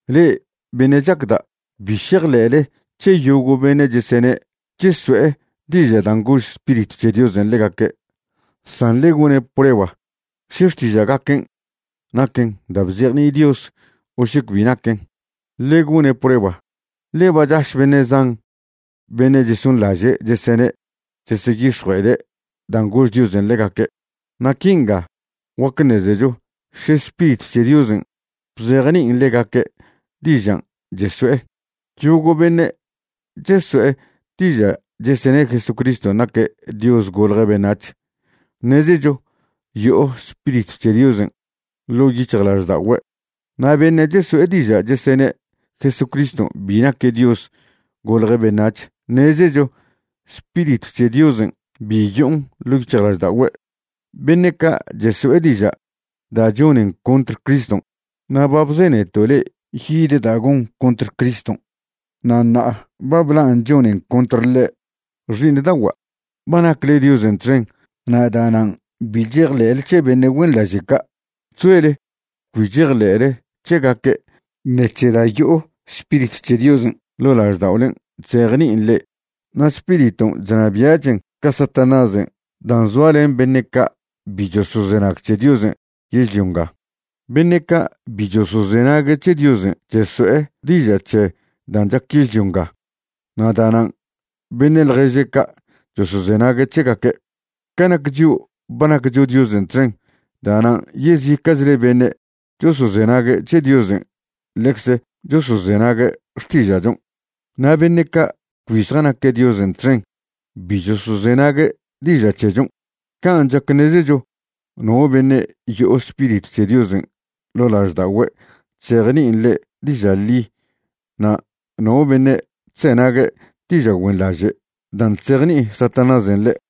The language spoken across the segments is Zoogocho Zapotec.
Le'e beṉe' chacda', bi šejḻe'le c̱he yogo' beṉe' chesene' cheso'e diža' dan' gož Spiritw c̱he Diosen' ḻegaque', san ḻe gone' prueba še xtiža'gaquen' naquen da' bzejni'i Dios o še cbi naquen. Ḻe gone' prueba, ḻe ba chaš beṉe' zan beṉe' chesonḻaže' chesene' cheseyix̱jue'ede' dan' gož Diosen' ḻegaque'. Na' quinga guac ṉezecho še Spiritw c̱he Diosen' bzejni'in ḻegaque' dižan' cheso'e: yogo' beṉe' cheso'e diža' chesene' Jesucriston' naque' Dios golje' beṉac̱h, ṉezecho yo'o Spiritw c̱he Diosen' ḻo' yic̱hjlažda'ogüe'. Na' beṉe' cheso'e diža' chesene' Jesucriston' bi naque' Dios golje' beṉac̱h, ṉezecho Spiritw c̱he Diosen' bi yo'on ḻo' yic̱hjlažda'ogüe'. Beṉe' ca' cheso'e diža' da' chonen contr Criston'. Na' ba bzeneto' le'e yid da' gon contr Criston' na' ṉa'a ba blan' chonen contr ḻe'. Xi'iṉda'ogua', ba nacle Diosen' txen na' da'nan' bi chejḻe'le c̱he beṉe' güenḻaže' ca'. Chzoele cbi chejḻe'le c̱hegaque' ṉec̱he da' yo'o Spiritw c̱he Diosen' ḻo' lažda'olen' chzejni'in le'e, na' Spiriton' chnabia'chen ca Satanásen' dan' zoa len beṉe' ca' bi chosozenag c̱he Diosen' yežlio nga. Beṉe ca' bi chosozenague' c̱he Diosen' cheso'e diža' c̱he dan' chac yežlio nga, na' da'nan' beṉe' ḻježe' ca' chosozenague' c̱hegaque'. Ca nac chio', ba naccho Diosen' txen. Da'nan' yezica'chle beṉe' chosozenague' c̱he Diosen' ḻecz chosozenague' xtiža'chon'. Na' beṉe' ca' cbi zjanaque' Diosen' txen bi chosozenague' diža' c̱hechon'. Can' chac ṉezecho no beṉe' yo'o Spiritw c̱he Diosen' ḻo' lažda'ogüe' chzejni'in ḻe' diža' ḻi na' no beṉe' chzenague' diža' güenḻaže' dan' chzejni'i Satanásen' ḻe'.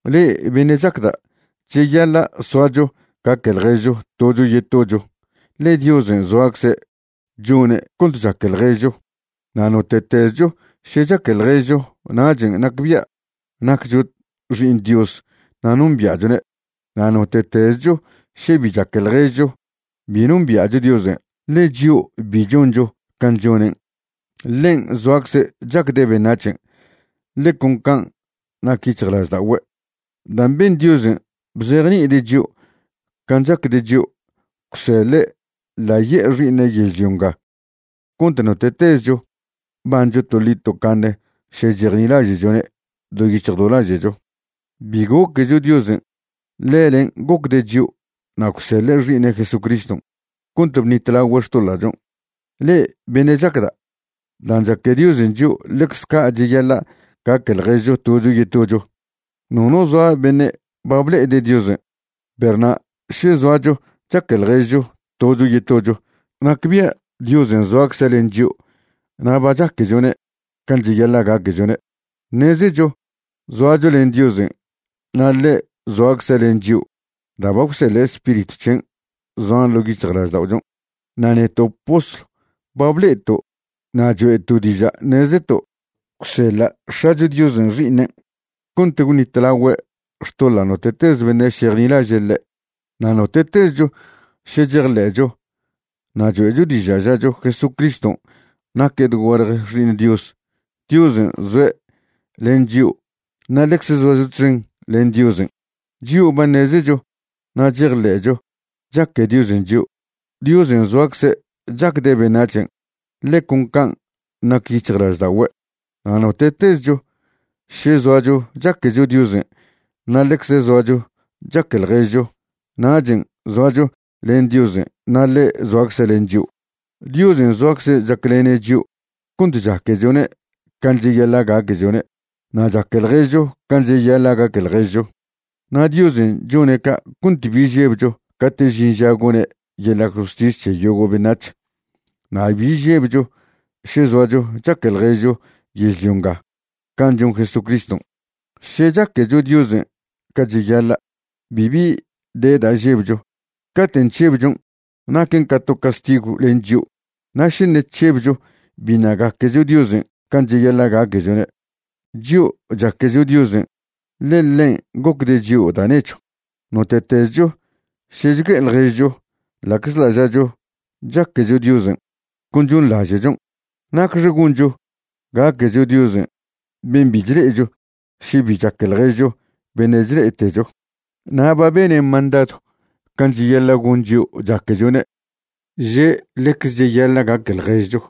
Le'e beṉe' chacda', cheyaḻa' soacho gaque ḻježcho tocho yetocho, ḻe Diosen' zoacze' chone' cont chaque ḻježcho. Na' note'tezcho še chaque ḻježcho nachen' nacbia' naccho xi'iṉ Dios na' nombia'chone'. Na' note'tezcho še bi chaque ḻježcho bi nombia'cho Diosen', ḻe chio' bi choncho can' chonen'. Ḻen' zoacze' chacde' beṉac̱hen', ḻe con can' nac yic̱hjlažda'ogüe'. Dan' ben Diosen' bzejni'ide' chio' can' chacde' chio', gwseḻe' ḻaye'e Xi'iṉe' yežlio nga cont note'tezcho bancho toḻi tocaṉe še chejnilaže'chone' do yic̱hj do laže'cho. Bi goquecho Diosen'; ḻelen' gocde' chio' na' gwseḻe' Xi'iṉe' Jesucriston' cont bṉitlagüe' xtoḻa'chon'. Le'e beṉe' chacda', dan' chaque Diosen' chio' ḻecz ca' cheyaḻa' gaque ḻježcho tocho yetocho. Nono zoa beṉe' ba ble'ede' Diosen'. Perw na' še zoacho chaque ḻježcho tocho yetocho, nacbia' Diosen' zoacze' len chio' na' ba chaquechone' can' cheyaḻa' gaquechone'. Ṉezecho zoacho len Diosen' na' ḻe' zoacze' len chio' da' ba gwseḻe' Spiritw c̱hen' zoan ḻo' yic̱hjlažda'ochon'. Na' neto' postlw ba ble'eto' na' choe'to' diža' ṉezeto' gwseḻa' X̱acho Diosen' Xi'iṉen' cont gwṉitlagüe' xtoḻa' note'tez beṉe' šejnilaže' ḻe'. Na' note'tezcho še chejḻe'cho na' choe'cho diža' žacho Jesucriston' naque' dogualje Xi'iṉ Dios, Diosen' zoe' len chio' na' ḻecz zoacho txen len Diosen'. Chio' ba ṉezecho na' chejḻe'cho chaque Diosen' chio'. Diosen' zoacze' chacde' beṉac̱hen', ḻe con can' nac yic̱hjlažda'ogüe'. Na' note'tezcho še zoacho chaquecho Diosen' na' ḻecze zoacho chaque ḻježcho, nachen' zoacho len Diosen' na' ḻe' zoacze' len chio'. Diosen' zoacze' chaclene' chio' cont chaquechone' can' cheyaḻa' gaquechone' na' chaque ḻježcho can' cheyaḻa' gaque ḻježcho, na' Diosen' chone' ca' cont bi žebcho cate' žin ža gone' yeḻa' justis c̱he yogo' beṉac̱h. Na' bi žebcho še zoacho chaque ḻježcho yežlio nga can' chon Jesucriston'. Še chaquecho Diosen' ca cheyaḻa', bibi de da' žebcho. Caten' chžebchon' naquen ca to castigw len chio', na' še ṉe' chžebcho biṉa' gaquecho Diosen' can' cheyaḻa' gaquechone'. Chio' chaquecho Diosen' ḻe ḻen' gocde' chio' da' nechw. Note'tezcho še chgue'e ḻježcho, ḻa'czḻa' žacho chaquecho Diosen', con chonḻaže'chon'. ¿Nacxe goncho gaquecho Diosen' ben' bi chle'echo še bi chaque ḻježcho beṉe' chle'etecho? Na' ba bene' mandadw can' cheyaḻa' gon chio' chaquechone', že' ḻecz cheyaḻa' gaque ḻježcho.